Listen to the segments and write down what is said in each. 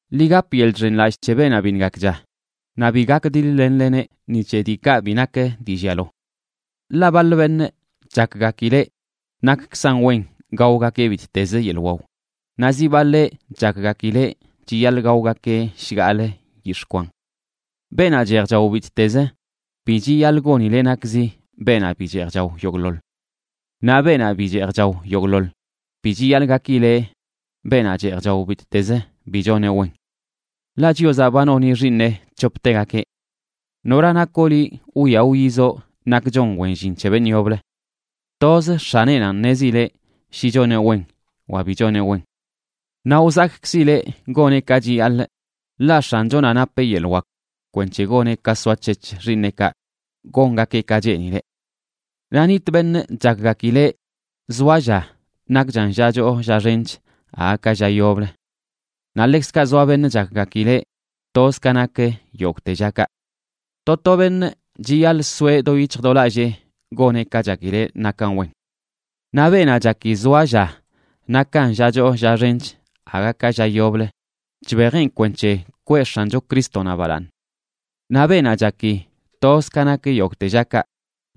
Ḻi gap yeḻꞌ chxenlallꞌ c̱he beenaꞌ biṉꞌ gakcha, naꞌ bi gakdiḻ-lenleneꞌ ni c̱he diikaꞌ bi nak dii llialo. Ḻaꞌ baḻ beṉꞌ chakgakileꞌ nakkzan wen gaogakeꞌ bittezə yeḻꞌ wao, naꞌ zi baḻeꞌ chakgakileꞌ chiyaḻꞌ gaogakeꞌ shgaḻꞌ yix̱ꞌ kwan. Beenaꞌ cheej chao bittezə, bi chiyaḻꞌ gonileꞌ nakzi beenaꞌ bi cheej chao yogꞌḻoḻ. Naꞌ beenaꞌ bi cheej chao yogꞌḻoḻ, bi chiyaḻꞌ gakileꞌ beenaꞌ cheej chao bittezə bi choneꞌ wen. Ḻaꞌ Chiozaꞌ ba noni xiiṉeꞌ c̱hoptegakeꞌ. ¿Nora nakoꞌ liꞌ wwia wyizoꞌ nak chon wen llin c̱he beṉꞌ yoblə? Toz x̱aneꞌnanꞌ ṉezileꞌ shi choneꞌ wen wa bi choneꞌ wen. Naꞌ wzakkzileꞌ goneꞌ ka chiyaḻꞌ, ḻaꞌ X̱anchonaꞌ napeꞌ yeḻꞌ wak kwenc̱he goneꞌ ka soac̱hec̱h xiiṉeꞌkaꞌ gongakeꞌ ka cheenileꞌ. Naꞌ nitꞌ beṉꞌ chakgakileꞌ zoa lla nakchan lla choo lla xench aga ka lla yoblə. Naꞌ ḻekzkaꞌ zoa beṉꞌ chakgakileꞌ toz ka nak yogꞌte llakaꞌ. To to beṉꞌ chiyaḻꞌ soeꞌ do yic̱hj do lallee goneꞌ ka chakileꞌ nakan wen. Naꞌ beenaꞌ chaki zoa lla nakan lla choo lla xench aga ka lla yoblə, chbejeꞌn kwenc̱he kwee X̱ancho Crístonaꞌ balaaṉ. Naꞌ beenaꞌ chaki toz ka nak yogꞌte llakaꞌ,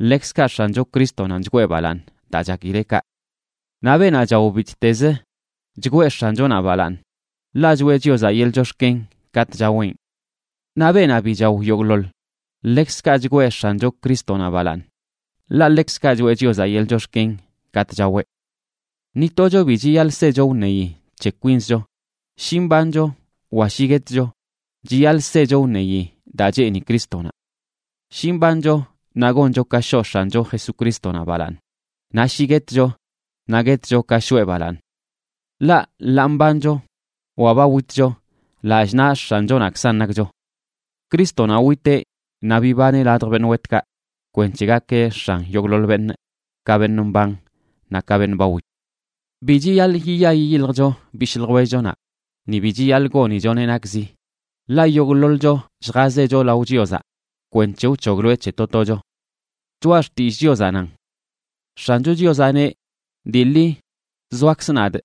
ḻekzkaꞌ X̱ancho Crístonanꞌ chgwee balaaṉ daa chakileꞌ kaꞌ. Naꞌ beenaꞌ chao bittezə, chgwee X̱anchonaꞌ balaaṉ, ḻaꞌ choꞌe Chiozaꞌ yeḻꞌ chox̱ken katꞌ chaweꞌn. Naꞌ beenaꞌ bi chao yogꞌḻoḻ, ḻekzkaꞌ chgwee X̱ancho Crístonaꞌ balaaṉ, ḻaꞌ ḻekzkaꞌ choꞌe Chiozaꞌ yeḻꞌ chox̱ken katꞌ chaweꞌ. Ni tocho bi chiyaḻꞌ secho wṉeyi c̱he kwinzcho. Shi mbancho wa shi guetcho chiyaḻꞌ secho wṉeyi daa cheeni Crístonaꞌ. Shi mbancho naꞌ goncho ka shoꞌ X̱ancho Jesucrístonaꞌ balaaṉ, naꞌ shi guetcho naꞌ guetcho ka shoꞌe balaaṉ. Ḻaꞌ, ḻaa mbancho wa ba witcho, lallꞌ naꞌ X̱anchonaꞌkzan nakcho. Crístonaꞌ witeꞌ naꞌ bibaneꞌ ladj beṉꞌ wetkaꞌ kwenc̱he gakeꞌ X̱an yogꞌḻoḻ beṉꞌ, ka beṉꞌ mban naꞌ ka beṉꞌ ba wit. Bi chiyaḻꞌ yiya yiyiljcho bishꞌ ljwellchonaꞌ, ni bi chiyaḻꞌ gonichoneꞌ nakzi. Ḻaꞌ yogꞌḻoḻcho lljazecho lao Chiozaꞌ kwenc̱he wc̱hogloeꞌ c̱he to tocho. Choꞌa Xtillꞌ Chiozaꞌ nan: X̱ancho Chiozaꞌ neꞌ, dii ḻi zoakzꞌ nadꞌ,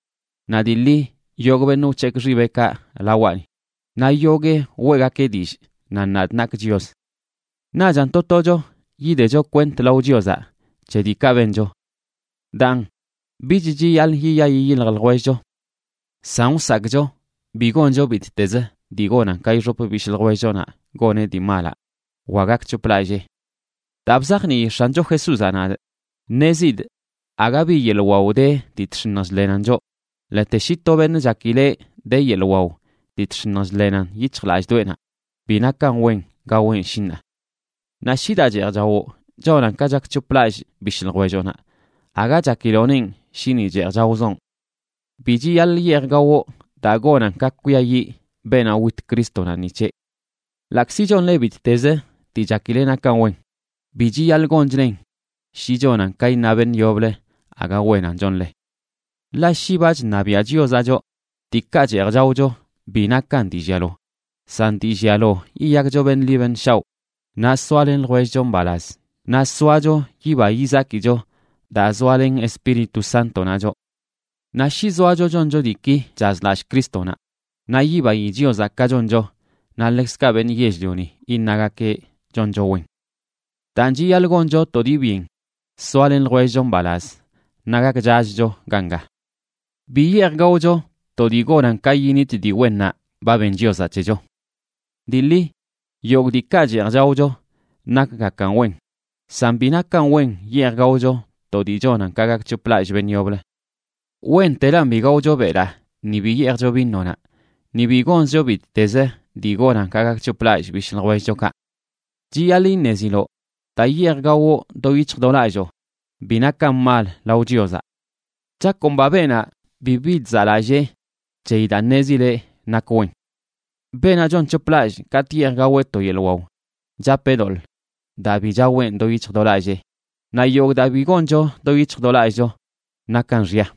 naꞌ dii ḻi yogꞌ beṉꞌ wc̱hekꞌ xibeꞌkaꞌ lawaꞌni, naꞌ yoguee weꞌgakeꞌ dillꞌ nan nadꞌ nakꞌ Chios. Naꞌchan to tocho yidecho kwent lao Chiozaꞌ c̱he diikaꞌ bencho. Daan, bich chiyaḻꞌ yiya yiyilj ljwellcho. San wsakꞌcho bi goncho bittezə dii gonan ka ixop bishꞌ ljwellchonaꞌ goneꞌ dii malaꞌ wa gakc̱hoplallee. Daa bzajnii X̱ancho Jesúzaꞌ nadꞌ, ṉezidꞌ aga bi yeḻꞌ wao de dii chx̱iṉj chḻenan choꞌ, ḻete shi to beṉꞌ chakileꞌ de yeḻꞌ wao dii chx̱iṉj chḻenan yic̱hjlallꞌdoꞌenaꞌ, bi nakan wen gaweꞌn shi ṉaa. Naꞌ shi daa cheej chawoꞌ chonan ka chakc̱hoplallꞌ bishꞌ ljwelloꞌnaꞌ, aga chakiloꞌnenꞌ shi ni cheej chaozoꞌn. Bi chiyaḻꞌ yeej gawoꞌ daa gonan ka kwiayiꞌ beenaꞌ wit Crístonaꞌ ni c̱heꞌ. Ḻaꞌkzi chonle bittezə dii chakile nakan wen, bi chiyaḻꞌ gonchlen shi chonan ka iṉa beṉꞌ yoblə aga wenan chonle. Ḻaꞌ shi ba chṉabiaꞌ Chiozaꞌ choꞌ, diikaꞌ cheej chaocho bi nakan dii llialo, san dii llialo yiyakcho beṉꞌ ḻi beṉꞌ shaoꞌ naꞌ soalen ljwellcho mbalaz, naꞌ soacho yiba yizakicho daa zoalen Espíritu Sántonaꞌ choꞌ. Naꞌ shi zoacho choncho diiki chazlallꞌ Crístonaꞌ, naꞌ yibayi Chiozaꞌ ka choncho naꞌ ḻekzkaꞌ beṉꞌ yell-lioni iṉagakeꞌ choncho wen. Daan, chiyaḻꞌ goncho to dii byen soalen ljwellcho mbalaz naꞌ gakchachcho ganga. Bi yeej gaocho to dii gonan ka yinit dii wennaꞌ ba ben Chiozaꞌ c̱hecho. Dii ḻi, yogꞌ diikaꞌ cheej chaocho nakgakan wen, san bi nakan wen yeej gaocho to dii chonan ka gakc̱hoplallꞌ beṉꞌ yoblə. Wentelan bi gaocho belaa ni bi yeejcho vinonaꞌ, ni bi gonzcho bittezə dii gonan ka gakc̱hoplallꞌ bishꞌ ljwellchokaꞌ. Chiyaḻꞌ iṉeziloꞌ daa yeej gawoꞌ do yic̱hj do lalloo bi nakan mal lao Chiozaꞌ. Chakomba beenaꞌ bibi chzaꞌlallee c̱heyi daa ṉezileꞌ nak wen. Beenaꞌ chonc̱hoplallꞌ katꞌ yeej gaweꞌ to yeḻꞌ wao, chapeꞌ doḻꞌ daa bi chaweꞌn do yic̱hj do lallee. Naꞌ yogꞌ daa bi goncho do yic̱hj do lallꞌcho, nakan xya.